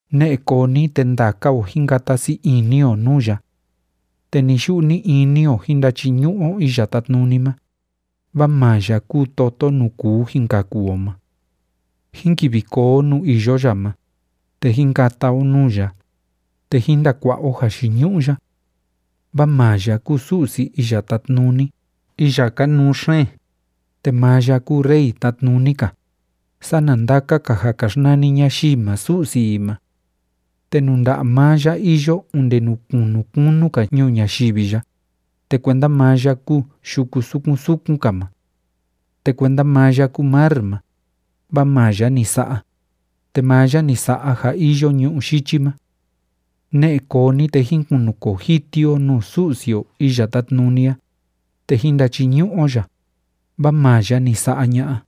Ne'e koo ni, te ndaka o jín kata sii ini o nuu ya. Te ni‑yu'u ni‑ini o jín ndachiñu'u o Iya Tátnuni ma, vaa maa ya kúu toto nuu kuu jin kaku o ma. Jín kivi koo o nuu iyo ya ma, te jín kata o nuu ya, te jín ndakua'a o jayiñu'u ya. Vaa maa ya kúu Su'si Iya Tátnuni iya kanuu xeen, te maa ya kúu Rey tatnuni‑ka sana ndaka‑ka ja ka xnani ñayii ma su'si i ma. Te nuu nda'a maa ya iyo onde nuu kunu kunu‑ka ñuu ñayivi ya, te kuenda maa ya kúu yuku sukun sukun‑ka ma. Te kuenda maa ya kúu mar ma, vaa maa ya ni sa'a, te maa ya ni sa'a ja iyo ñu'ú yichi ma. Ne'e koo ni, te jín kunukoo jiti o nuu Su'si o Iya Tátnuni a, te jín ndachiñu'u o ya, vaa maa ya ni sa'a ña'a,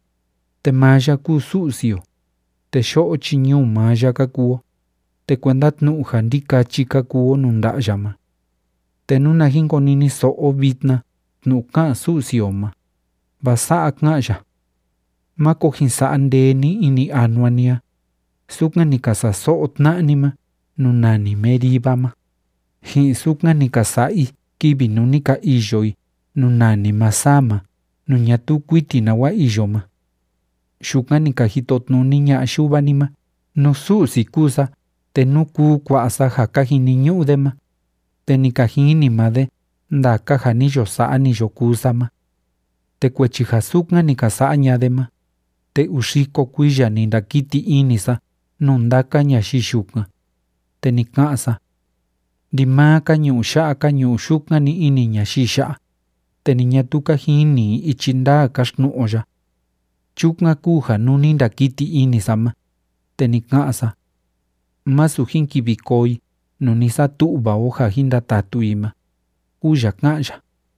te maa ya kúu Su'si o, te yo'o chi ñuu maa ya ka kuu o, te kuenda tnu'u ja ndikachi ka kuu o nuu nda'a ya ma. Te nuna jin koniniso'o o vitna tnu'u ká'an Su'si o ma, vaa sa'a ká'an ya: “Máko jin sa'a ndee ni ini anua ni a, sukan ni ka sa'a so'o tna'a ni ma nuu nani Meriba ma, ji'in sukan ni ka sa'a i kivi nuu ni ka iyo i nuu nani Masah ma nuu ñatuu kuiti nawa iyo ma. Yukan ni ka jitotnuni ña'a yuva ni ma nú Su'si kúu sa te nú kuu kua'a sa ja ka jiniñu'u de ma, te ni ka jini maa de ndaka ja ni yo sa'a, ni yo kuu sa ma. Te kuechi ja sukan ni ka sa'a ña'a de ma, te uu xiko kuiya ni ndakiti ini sa nuu ndaka ñayii yukan, te ni ka'an sa: Ndimaa ka ñu'u ya'a ka ñu'u yukan‑ni ini ñayii ya'a, te ni ñatuu ka jini i ichi ndaa káxtnu'u o ya. Chukan kúu ja nuu ni ndakiti ini sa ma, te ni ka'an sa: Másu jin kivi koo i nuu ni satu'va o ja jin ndatatu i ma”, kúu ya ká'an ya.